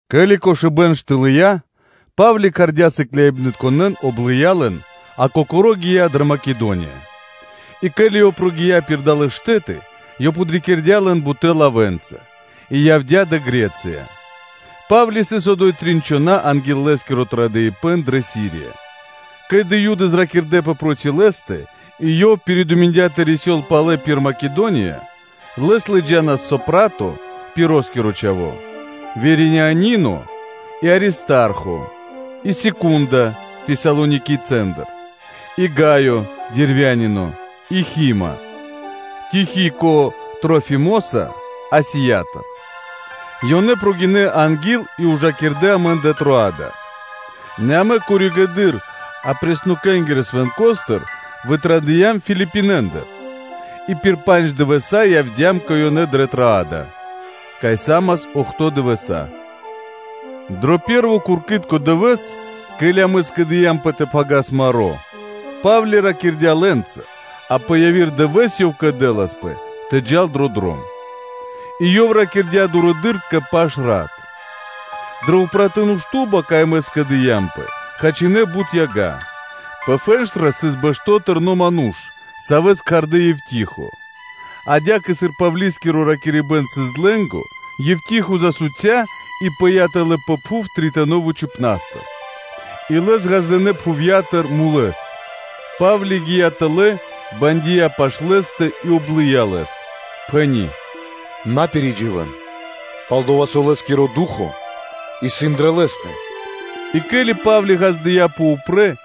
Ке́ли кошыбэ́н штылыя, Па́вли кхардя́ сыкляибнытконэ́н, облыя лэн, а кокоро́ гия́ дрэ Македония. И ке́ли ёв прогия́ пир далэ́ штэ́ты, ёв подрикирдя лэн бутэ́ лавэ́нца, и явдя́ дрэ Гре́цыя (Бала́мия). Па́вли сыс одо́й трин чхона́ анги́л лэ́скиро традыпэн кэ Сирия, ке́ли Юды зракирдэпэ проти лэ́стэ, и ёв пиридуминдя тэ рисёл палэ пир Македония. Лэс лыджа́нас Сосипатро, Пироскиро чхаво́, Вериянино, а Аристархо и Секундо Фесалоникийцэндыр, и Гаё Дервянино и Хима (Тимофеё), Тихико Трафимоса Асиятыр. Ёнэ прогинэ́ анги́л и ужакирдэ амэн дрэ Троада; нэ амэ коригэды́р (позжэды́р) Апреснокэнгирэ Свэнкостыр вытрадыям Филипинэндыр, и пир пандж дывэса́ явдя́м кэ ёнэ дрэ Троада, кай са́мас охто́ (бидуе́нгиро дэш) дывэса́. Дро пэ́рво куркитко дывэ́с, ке́ли амэ скэдыямпэ тэ пхагирас маро́, Па́вли ракирдя́ лэ́нца, а пэ яви́р дывэ́с ёв кэдэласпэ тэ джал дро дром. И ёв ракирдя́ дурэды́р кэ пашрат. Дрэ упратуны шту́ба, кай амэ скэдыямпэ, хачинэ бут яга. Пэ фэнштра сыс бэшто́ тэрно́ ману́ш, савэ́с кхардэ́ о Евтихо, адя́кэ сыр Павли́скиро ракирибэ́н сыс длэ́нго (гара́), Евтихо засуця и пыя́ тэлэ́ пэ пхув тритонэ вучыпнастыр (этажостыр), и лэс ґаздынэ́ пхувья́тыр мулэс. Па́вли гия́ тэлэ́, бандия пашы́л лэ́стэ и облыя лэс, пхэни́: “На пиридживэн, пал-дова́ со лэ́скиро ду́хо (фа́но) исын дрэ лэ́стэ.” И ке́ли Па́вли ґаздыя́пэ упрэ́,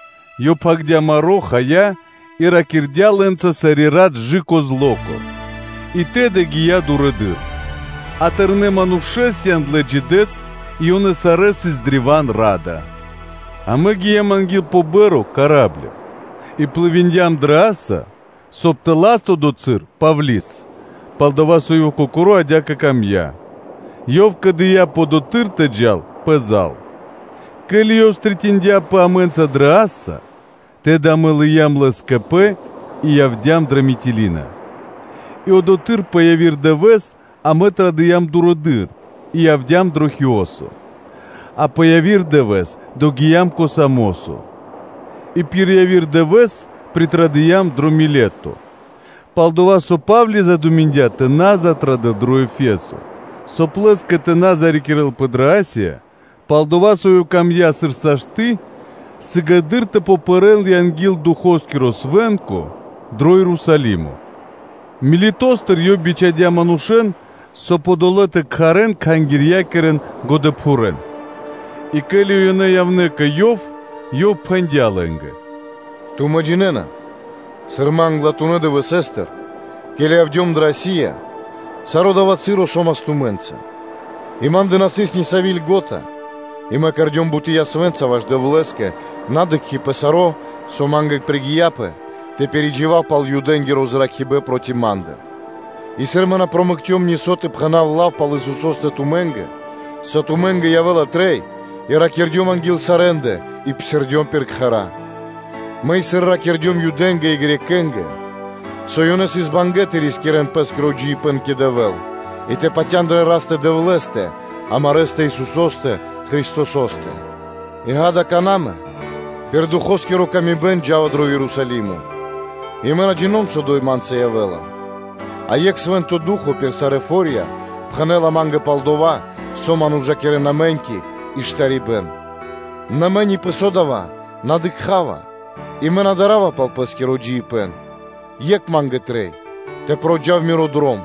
ёв пхагирдя́ маро́, хая, и ракирдя́ лэ́нца сари́ рат кэ/жы́ко зло́ко (ра́нко), а тэды гия́ дурэды́р. А тэрнэ́ манушэ́с яндлэ́ джидэс, и ёнэ сарэ́ сыс древа́н ра́да. Амэ гиям анги́л пэ па́рма (корабле) и плывиндям (дыям пли́ма) дро Асо, соб (кай) тэ лас одотхы́р Павли́с: пал-дова́ со ёв кокоро́ адя́кэ камдя́, ёв кэдыяпэ одотхы́р тэ джал пэзал. Ке́ли ёв стрэниндяпэ (дыкхцяпэ) амэ́нца дро Асо, тэды амэ лыям лэс кэ пэ и явдя́м дрэ Митилина, И одотхы́р пэ яви́р дывэ́с амэ традыям дурэды́р и явдя́м дро Хиосо, а пэ яви́р дывэ́с догиям кэ Самосо, и пир яви́р дывэ́с притрадыям дро Милето: пал-дова́ со Па́вли задуминдя тэ на затрадэл дро Ефесо, соб (кай) лэ́скэ тэ на зарикирэлпэ дрэ Асия, пал-дова́ со ёв камдя́, сыр сашты́ сыгэды́р тэ пэрэ́л одори́к анги́л Духоскиро Свэ́нко ду́хо дро Ерусалимо. Милетостыр ёв бичхадя́ манушэ́н, соб (кай) одолэ́ тэ кхарэ́н кхангирья́кирэ годэпхурэн. И ке́ли ёнэ явнэ́ кэ ёв, ёв пхэндя́ лэ́нгэ: “Тумэ́ джинэ́на, сыр мэ англатунэ́ дывэсэ́стыр, ке́ли явдём дрэ Асия, саро́ дава́ часо со́мас тумэ́нца, и мэ кандыём сарэскэ, и мэ кэрдём буты́ ясвэ́нца ваш Дэвлэ́скэ, на дыкхи́ пэ саро́, со ма́нгэ пригияпэ тэ пиридживав пал Юдэ́нгиро зракирибэ́н проти ма́ндэ; и сыр мэ на промэкцём нисо́ тэ пхэна́в лав пал Исусо́стэ тумэ́нгэ, со тумэ́нгэ явэ́ла трэй, и ракирдём анги́л сарэ́ндэ и псирдём пир кхэра́, мэ и сыр ракирдём Юдэ́нгэ и Грекэ́нгэ (Баламэ́нгэ), со ёнэ сыс бангэ́ (мусиндлэ) тэ рискирэ́н пэ́скиро джиибэ́н кэ Дэвэ́л и тэ патя́н дрэ Растэ-Дэвлэ́стэ, амарэ́ Исусо́стэ Христосо́стэ. И, ґа́да, какана́ мэ, сыр Ду́хо (Фа́но) лыджа́ла ман, мэ джа́ва нэ Ерусалимо, и мэ на джино́м, со одо́й ма́нца явэ́ла; а екх Свэ́нто Ду́хо (Фа́но) пир сарэ́ фо́рья пхэнэ́ла ма́нгэ пал дова́, со ман ужакирэ́на мэ́ньки и штарибэ́н. Нэ мэ ни пэ со дава́ на дыкха́ва, и мэ на дарава пал пэ́скиро джиибэ́н, екх ма́нгэ трэй тэ проджав миро дром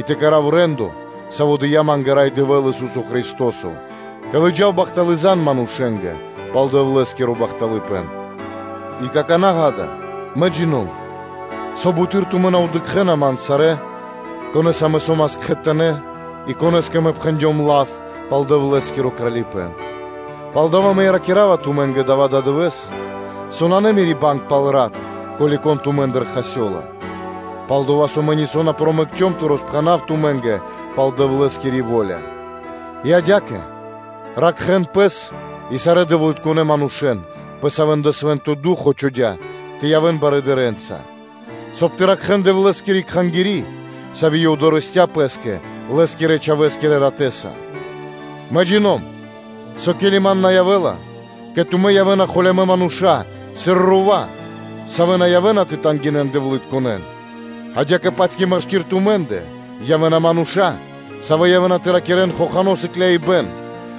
и тэ кэра́в рэ́ндо (де́ло), саво́ дыя́ ма́нгэ Рай Дэвэ́л, Ису́со Христо́со, тэ лыджав бахталы́ зан (звесь) манушэ́нгэ пал Дэвлэ́скиро бахталыпэ́н. И какана́, ґа́да, мэ джино́м, со буты́р тумэ́ на дыкхэ́на ман сарэ́, конэса мэ со́мас кхэтанэ́ и конэ́скэ мэ пхэндём лав пал Дэвлэ́скиро Кралипэ́н. Палдава́ мэ и ракира́ва тумэ́нгэ дава́ ададывэ́с, со нанэ мири́ банг пал рат, ко́ли кон тумэ́ндыр хасёла, пал-дова́ со мэ нисо́ на промэкцём тэ роспхэнав тумэ́нгэ пал Дэвлэ́скири во́ля. И адя́кэ ракхэ́н пэс и сарэ́ дэвлытконэ́ манушэ́н, савэ́н Свэ́нто Ду́хо (Фа́но) чхудя́ тэ явэ́н кхангирья́кирэ барыдырэ́нца (дыкхибнаскирэнца), соб (кай) тэ ракхэ́н Дэвлэ́скири Кхангири́, сави́ Ёв дорэсця́ Пэ́скэ Лэ́скирэ-Чхавэ́скирэ Ратэ́са. Мэ джино́м, со ке́ли ман на явэ́ла, кэ тумэ́ явэ́на холямэ́ мануша́, сыр рува́, савэ́ на явэ́на тэ тангинэн (жалинэн) дэвлытконэн; адя́кэ-паць и машки́р тумэ́ндэ явэ́на мануша́, савэ́ явэ́на тэ ракирэ́н хохано́ сыкляибэн,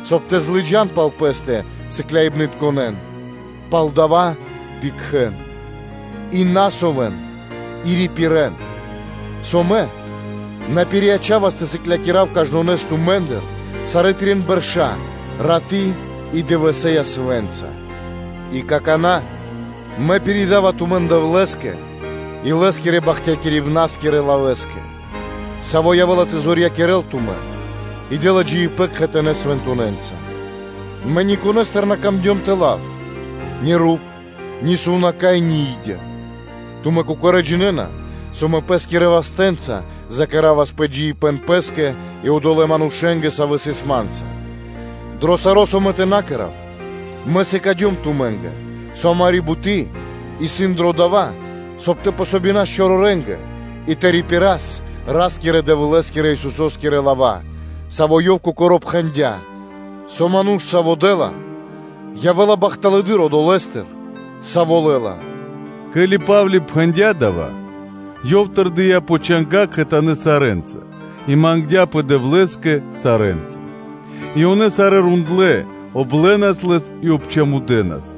соб (кай) тэ злыджан пал пэ́стэ сыкляибнытконэ́н. Палдава́ дыкхэ́н и ракхэ́нпэ и рипирэ́н, со мэ на пириячавас тэ сыклякирав кажнонэс тумэ́ндыр сарэ́ трин бэрш а раты́ и дывэсэ́ ясвэ́нца. И какана́, мэ пиридава тумэн Дэвлэ́скэ и Лэ́скирэ бахтякирибнаскирэ лавэ́скэ, саво́ явэ́ла тэ зорьякирэл тумэн и дэ́ла джиибэ́н кхэтанэ́ свэнтонэнца. Мэ никонэстыр на камдём тэ лав ни руп, ни сувнака́й, ни и́дя. Тумэ́ кокорэ́ джинэ́на, со мэ пэ́скирэ вастэ́нца закэравас пэ джиибэ́н пэ́скэ и одолэ́ манушэ́нгэ, савэ́ сыс ма́нца. Дро саро́, со мэ тэ на кэра́в, мэ сыкадём тумэ́нгэ, со амари́ буты́ исын дро дова́, соб (кай) тэ помогинас чорорэнгэ, и тэ рипирас Ра́скирэ-Дэвлэ́скирэ Исусо́скирэ лава́; савэ́ Ёв Кокоро́ пхэндя́, со ману́ш, саво́ дэ́ла, явэ́ла бахталэдыр одолэ́стыр, саво́ лэ́ла. Ке́ли Па́вли пхэндя́ дава́, ёв тэрдия́ пэ чанга́ кхэтанэ́ сарэ́нца и мангдя́пэ Дэвлэ́скэ сарэ́нца. И ёнэ сарэ́ рондлэ́, облэнас лэс и обчамудэнас,